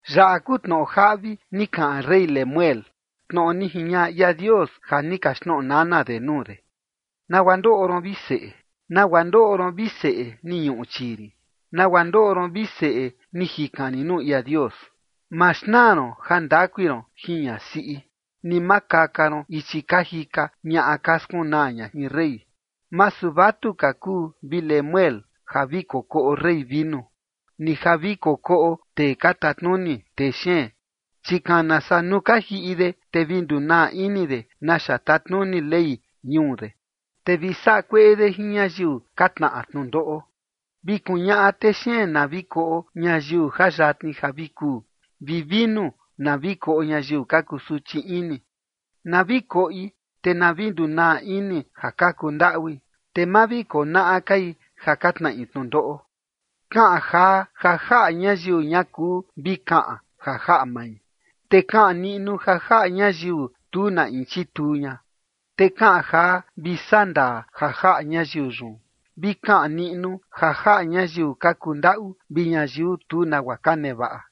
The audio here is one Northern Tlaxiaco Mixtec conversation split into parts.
Yaꞌa kuu tnoꞌo jaꞌvi ni kaꞌan rey Lemuel, tnoꞌo ni jiñaꞌa ia Dios ja ni kaxtnoꞌo nana de nuu de. ¿Nagua ndoꞌo ron, vi seꞌe? ¿Nagua ndoꞌo ron, vi seꞌe, ni ñuꞌu chii rin? ¿Nagua ndoꞌo ron, vi seꞌe, ni jikan rin nuu ia Dios? Ma xnaa ron jandakui ron jin ñasiꞌi, ni ma kaka ron ichi ka jika ñaꞌa ka skunaa ña jin rey. Masu vatuka kuu, vi Lemuel, ja vi kokoꞌo rey vinu, ni ja vi kokoꞌo tee ka tatnuni texeen. Chi kana saa nuu ka jiꞌi de, te vi ndunaa ini de naxa tatnuni ley ñuu de, te vi saꞌa kueꞌe de jin ñayiu ka tnaꞌa tnundoꞌo. Vi kuñaꞌa texeen na vi koꞌo ñayiu ja yatni ja vi kuu, vi vinu na vi koꞌo ñayiu ka kusuchi ini. Na vi koꞌi, te na vi ndunaa ini ja ka kundaꞌui, te ma vi konaꞌa kai ja ka tnaꞌi tnundoꞌo. Kaꞌan jaa, ja jaꞌa ñayiu ña kuu vi kaꞌan ja jaꞌa mai, te kaꞌan niꞌnu ja jaꞌa ñayiu tu na in chituu ña. Te kaꞌan jaa, vi saꞌa ndaa ja jaꞌa ñayiu yun, vi kaꞌan niꞌnu ja jaꞌa ñayiu ka kuu ndaꞌu vi ñayiu tu nagua ka nevaꞌa.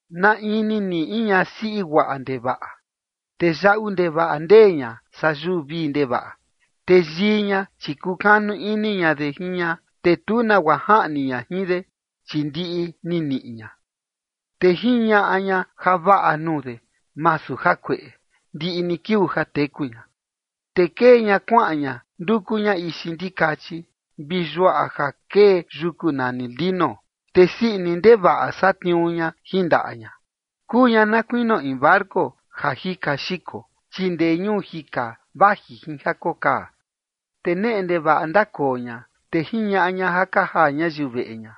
¿Na in ni niꞌi in ñasiꞌi guaꞌa ndevaꞌa? Te yaꞌu ndevaꞌa ndee ña saa yuu vii ndevaꞌa. Te yii ña, chi kukanu ini ña de jin ña, te tu nagua jaꞌni ña jin de, chi ndiꞌi ni niꞌi ña. Te jiñaꞌa ña javaꞌa nuu de, masu jakueꞌe, ndiꞌi ni kiuu ja teku ña. Te kee ña kuaꞌan ña nduku ña ixi ndikachi vi yuaꞌa ja kee yuku nani lino, te sii ini ndevaꞌa satniuu ña jin ndaꞌa ña. Kuu ña na kuinio in barco ja jika xiko, chi ndee ñuu jika vaji jin ja kokaa. Te neꞌe ndevaꞌa ndakoo ña, te jiñaꞌa ña ja ka jaa ñayiu veꞌe ña,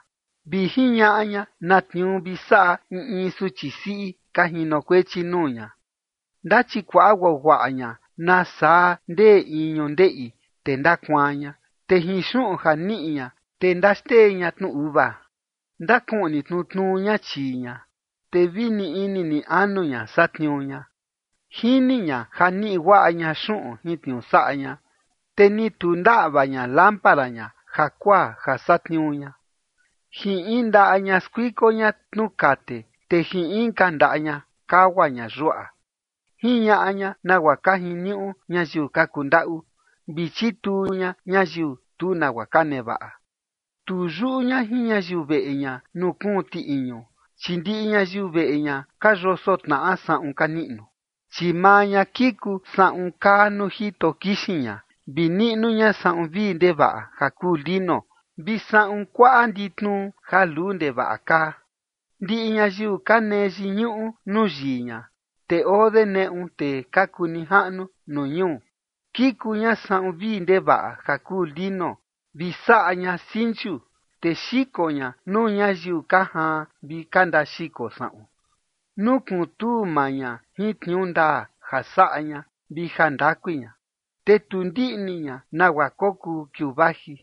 vi jiñaꞌa ña na tniuu vi saꞌa in in suchi siꞌi ka jinokuechi nuu ña. Ndachikuaꞌa guaguaꞌa ña nasaa ndee in ñundeꞌi, te ndakuaan ña, te jin xuꞌun ja niꞌi ña, te ndaxtee ña tnu uva. Ndakuꞌni tnutnuu ña chii ña, te vi ni ini ni anu ña satniuu ña. Jini ña ja niꞌi guaꞌa ña xuꞌun jin tniuu saꞌa ña, te ni tu ndaꞌva ña lámpara ña jakuaa ja satniuu ña. Jin in ndaꞌa ña skuiko ña tnu kate, te jin inka ndaꞌa ña kagua ña yuaꞌa. Jiñaꞌa ña nagua ka jiniuꞌu ñayiu ka kundaꞌu, vi chituu ña ñayiu tu nagua ka nevaꞌa. Tu yuꞌu ña jin ñayiu veꞌe ña nuu kuun tiꞌiñu, chi ndiꞌi ñayiu veꞌe ña ka yoso tnaꞌa saꞌun ka niꞌnu. Chi maa ña kiku saꞌun kaa nuu jito kixin ña, vi niꞌnu ña saꞌun vii ndevaꞌa ja kuu lino, vi saꞌun kuaꞌa nditnuu ja luu ndevaꞌa kaa. Ndiꞌi ñayiu ka nee yiñuꞌu nuu yii ña, te oo de neꞌu tee ka kuu nijaꞌnu nuu ñuu. Kiku ña saꞌun vii ndevaꞌa ja kuu lino, vi saꞌa ña sinchu, te xiko ña nuu ñayiu ka jaan vi ka ndaxiko saꞌun. Nukuntuu maa ña jin tniuu ndaa ja saꞌa ña vi jandakui ña, te tu ndiꞌni ña nagua kokuu kiuu vaji.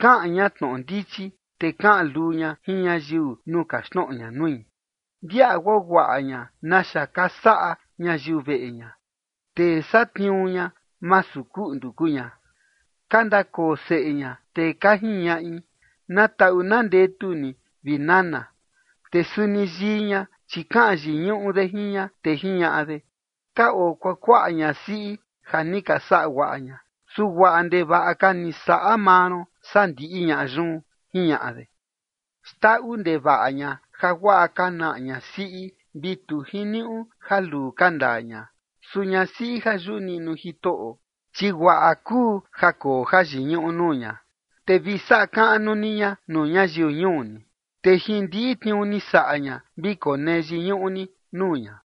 Kaꞌan ña tnoꞌo ndichi, te kaꞌan luu ña jin ñayiu nuu kaxtnoꞌo ña nui. Ndiaꞌa guaguaꞌa ña naxa ka saꞌa ñayiu veꞌe ña, te satniuu ña, masu kuꞌndu kuu ña. Ka ndakoo seꞌe ña, te ka jiñaꞌi: “Na taꞌu na ndetu ni, vi nana”; te suni yii ña, chi kaꞌan yiñuꞌu de jin ña, te jiñaꞌa de: “Ka oo kuakuaꞌa ñasiꞌi ja ni ka saꞌa guaꞌa ña, su guaꞌa ndevaꞌa ka ni saꞌa maa ron saa ndiꞌi ñaꞌa yun”. Jiñaꞌa de. Xndaꞌu ndevaꞌa ña jaguaꞌa ka naꞌa ñasiꞌi, vi tu jiniuꞌu ja luu ka ndaa ña, su ñasiꞌi ja yuꞌu niꞌnu Jitoꞌo, chi guaꞌa kuu ja koo jayiñuꞌu nuu ña. Te vi saꞌa kaꞌnu ni ña nuu ñayiu ñuu ni, te jin ndiꞌi tniuu ni saꞌa ña, vi konee yiñuꞌu ni nuu ña.